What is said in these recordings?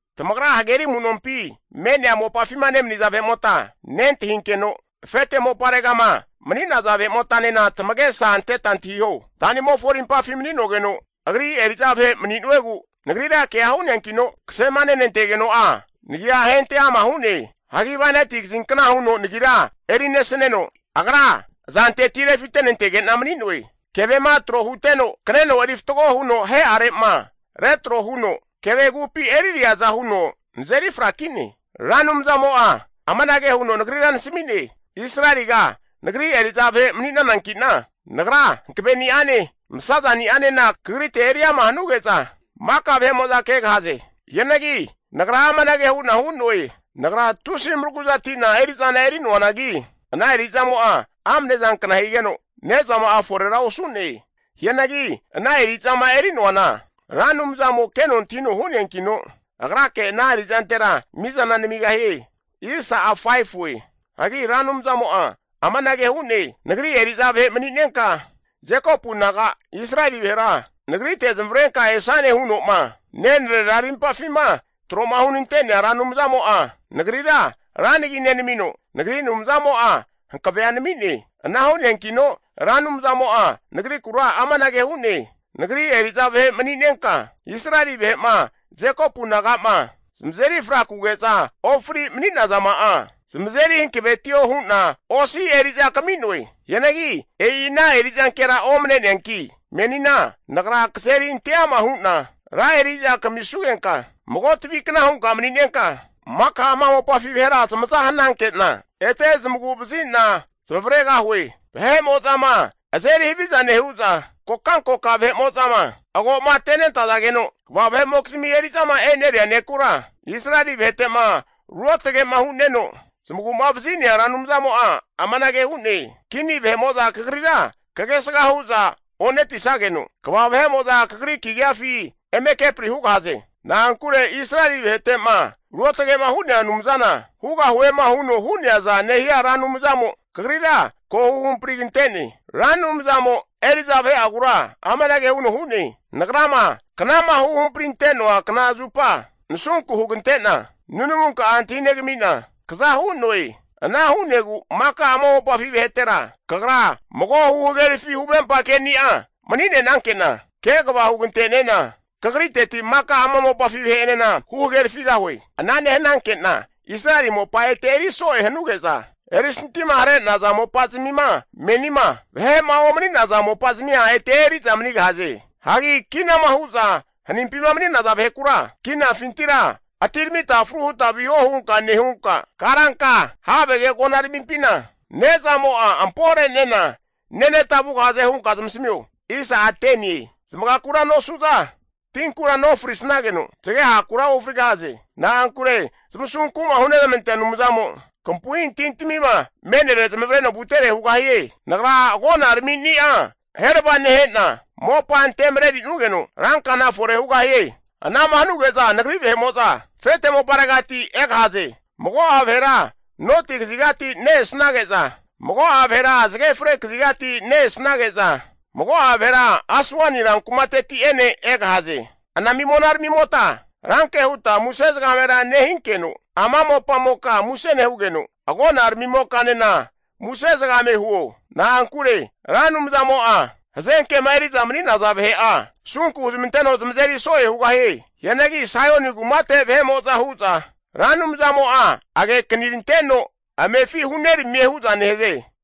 Tamagra hageri amu'nompi me'nea mopafima nemaniza vahe'mota nentahinkeno, afete moparegama mani'naza vahe'motanena tamagesa anteta antahiho, anta'nimofo arimpafi mani'nogeno Ra Anumzamo'a Agri eri'za vahe mani'nuegu nagrira kea hu'neankino, kasema nenantegeno'a nagia ahente ama hu'ne. Hagi bainati kazinkna huno nagira eri nesaneno, Agra azanteti refitentege'na mani'noe. Kevema tro huteno kaneno eri fatgo huno ahe'arema retro huno kevegupi eririaza huno nazeri frakine. Ra Anumzamo'a amanage hu'ne, nagrira nasami'ne, Israeliga Nagri eri'za vahe mani'nanankina, nagra hankaveni'ane masazani'anena kagrite eri ama hanuge'za, maka vahe'mo'za kegahaze. Hianagi nagra amanage hu'na hu'noe, nagra tusi maragu'zati'na eri'zana eri'noanagi, ana eri'zamo'a amne zankna higeno, ne'zama'a forera osu'ne. Hianagi ana eri'zama eri'noana Ra Anumzamo keno antahino hu'neankino, agrake ana eri'zantera mizana namigahie. Hagi Ra Anumzamo'a amanage hu'ne, Nagri eri'za vahe mani'nenka Jekopu naga Israeli vahera Nagrite zamavarenka esane huno'ma, nenrera arimpafima tro'ma hunente'nea Ra Anumzamo'a nagrira ra nagi nenamino, nagri Anumzamo'a hankavea nami'ne. Ana hu'neankino Ra Anumzamo'a nagrikura amanage hu'ne, Nagri eri'za vahe mani'nenka Israeli vahe'ma Jekopu naga'ma zamazeri frakuge'za ofri mani'nazama'a zamazeri hankavetio hu'na osi eri'za kami'noe. Hianagi e'i ana eri'zankera omne'neanki, menina Nagra kazeri ante'ama hu'na ra eri'za kamisugenka, mago tavikna hunka mani'nenka, maka ama mopafi vahera zamaza hananke'na, ete zamagu'vazi'na zamavaregahue. Vahe'mo'zama azeri haviza nehu'za kokankoka vahe'mo'zama agomatenentazageno kva vahe'mokizmi eri'zama eneria nekura Israeli vahetema Ruotge'ma hu'neno, zamagu'ma vazi'nea Ra Anumzamo'a amanage hu'ne, Kini vahe'mo'za kagrira kagesga hu'za onetisageno, kva vahe'mo'za kagri kagiafi eme kepri hugahaze. Na'ankure Israeli vahete'ma ruotage'ma hu'nea Anumzana, hugahuema huno hu'neaza nehia Ra Anumzamo kagrira ko huhamprigante'ne. Ra Anumzamo eri'za vahe'agura amanage huno hu'ne, Nagrama knama huhampri'noa kna zupa nasunku hugante'na, nunamunka'a antahinegami'na kaza hu'noe. Ana hu'negu maka ama mopafi vahetera, kagra mago huhagerafi huvempa keni'a mani'nenankena, kegava hugante'nena kagriteti maka ama mopafi vahe'enena huhagerafigahue. Ana nehananke'na Israeli mopa ete eri'soe hanuge'za, erisantima hare'naza mopa'zamima menima, vahe'ma omani'naza mopa'zamia ete eri'za manigahaze. Hagi kinama hu'za hanimpima mani'naza vahekura, kinafintira atiramita fru huta viho hunka nehunka, karanka havege agonaramimpina ne'zamo'a ampore'nena neneta vugahaze hunka zamasamio. Zamagakura nosu'za, tinkura nofrisnageno, zagehakura ofrigahaze. Na'ankure asunku'ma hunezmantea Anumzamo kampu'i tintamima me'nere zamavareno vutere hugahie. Nagra agonaramini'a aherava nehe'na mopa ante marerinugeno, rankana fore hugahie. Anama hanuge'za Nagri vahe'mo'za afete moparegati egahaze. Mago'a vahera noti kazigati ne-esnage'za, mago'a vahera zage fre kazigati ne-esnage'za, mago'a vahera Aswani ran kumateti'ene egahaze. Anami monaramimota, ranke huta muse zagamera nehinkeno, ama mopamoka muse nehugeno, agona ramimokanena muse zagame huo. Na'ankure Ra Anumzamo'a hazenkema eri'za mani'naza vahe'a asunku huzamanteno zamazeri so'e hugahie. Hianagi Saioni kumate vahe'mo'za hu'za, Ra Anumzamo'a agekaniranteno amefi huneramie hu'za nehaze.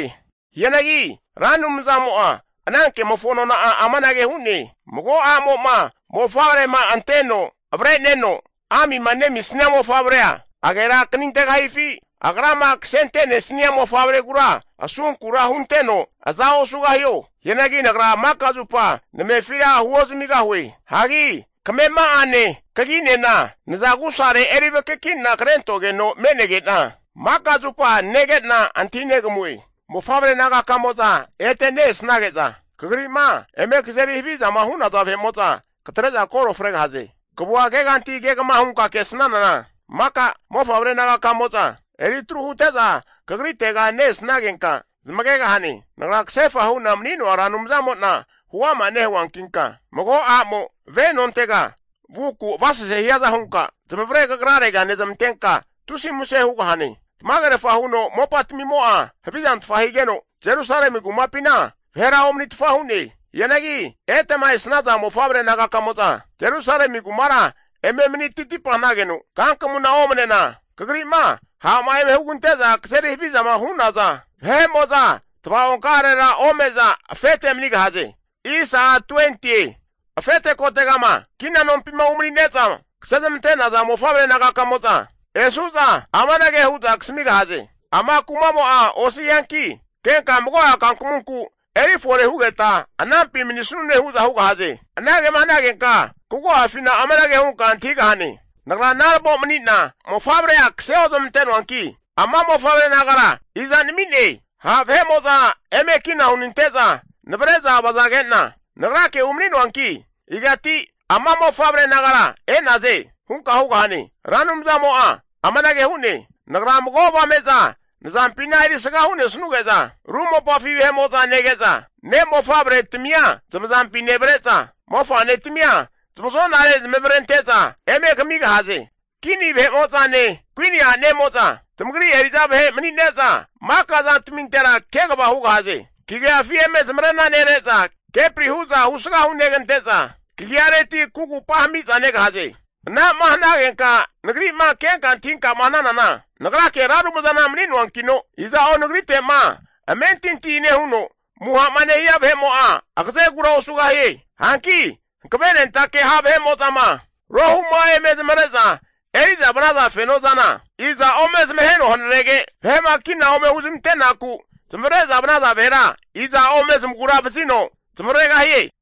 Hianagi Ra Anumzamo'a anankemofo nona'a amanage hu'ne, Mago a'mo'ma mofavrema anteno avre'neno amima nemisnia mofavrea agerakanintegahifi? Agrama kasente'nesia mofavregura asunkura hunteno aza osugahio? Hianagi Nagra maka zupa namefira huozamigahue. Hagi kamema'ane kaginena naza agusare eri vakaki'na krentogeno me'nege'na, maka zupa nege'na antahinegamue. Mofavre nagakamo'za ete ne-esnage'za, kagri'ma eme kazeri havizama hu'naza vahe'mo'za katre'za koro fregahaze. Kavua keganti kegama hunka kesnanana, maka mofavre nagaka'amo'za eri atru hute'za kagritega ne-esnagenka zamagegahane. Nagra kasefa hu'na mani'noa Ra Anumzamo'na huama nehuankinka, mago a'mo ve nontega vuku avasase hiaza hunka, zamavare kagrarega nezmantenka tusi muse hugahane. Tamagerfa huno mopa tamimo'a havizantfa higeno, Jerusalemi kumapina vahera omanitfa hu'ne. Hianagi etema esnaza mofavre nagakamo'za Jerusalemi kumara eme mani titipa hanageno kankamuna omanena, kagri'ma ha' eme hugante'za kazeri havizama hu'naza vahe'mo'za tvaonka'arera ome'za afete manigahaze. Afete kotegama kina nompima umanine'za kasezmante'naza mofavre nagakamo'za esu'za amanage hu'za eme kasamigahaze, ama kumamo'a osi hianki, kenka mago'a kankamunku eri fore hugeta anampi manisnune hu'za hugahaze. Anagema hanagenka kagu'afina amanage hunka antahigahane, nagra naravo mani'na mofavrea kase ozmante'noanki, ama mofavre nagara iza nami'ne? Ha' vahe'mo'za eme kina hunante'za navre'za vazage'na nagrake umani'noanki, igati ama mofavre nagara e'naze? hunka hugahane. Ra Anumzamo'a amanage hu'ne, Nagra mago avame'za nazampina erisga hu'nesnuge'za, ru mopafi vahe'mo'za nege'za, ne' mofavretamia zamazampi nevre'za, mofa'netamia zamazo'nare zamavarente'za eme kamigahaze. Kini vahe'mo'zane kuini a'nemo'za tamagri eri'za vahe mani'neza maka zantamintera kegava hugahaze. Kagiafi eme zamarena nere'za kepri hu'za husga hunegante'za kagiareti kugupa hami'za negahaze. Anama hanagenka nagri'ma kenka antahinkama hananana, Nagrake Ra Anumzana mani'noankino, iza'o nagrite'ma amentinti nehuno amuha'ma hania vahe'mo'a agazegura osugahie. Hanki hankavenentake ha' vahe'mo'zama rohu'ma eme zamare'za eri'za vanaza fenozana, iza ome zamaheno hanarege, vahe'ma kina ome huzmantenaku zamavare'za vanaza vahera, iza ome zamagura vazino zamavaregahie?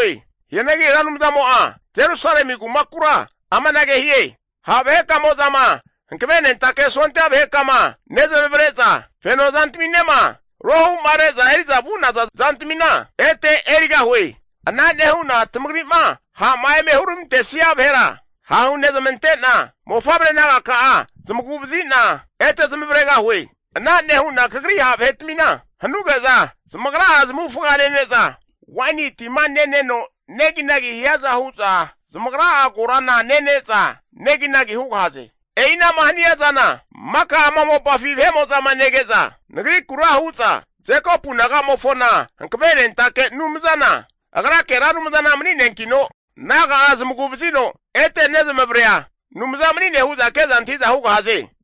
Hianagi Ra Anumzamo'a Jerusalemi kumakura amanage hie, Ha' vahekamo'zama hankavenentake sondia vahekama nezmavre'za feno zantaminema rohu'ma re'za eri'za vu'naza zantamina ete erigahue. Ana nehu'na tamagri'ma ha'ma eme huramantesia vahera hahunezmante'na, mofavre nagaka'a zamagu'vazi'na ete zamavaregahue. Ana nehu'na kagri ha' vahetamina hanuge'za zamagra'a zamavufaga nene'za, waini tima neneno neginagi hiaza hu'za, zamagra'a korana nene'za neginagi hugahaze. E'inama hania zana maka ama mopafi vahe'mo'zama nege'za, Nagrikura hu'za Jekopu nagamofona hankavenentake Anumzana Agrake Ra Anumzana mani'neankino naga'a zamagu'vazino ete nezamavarea Anumza mani'ne hu'za ke'za antahi'za hugahaze.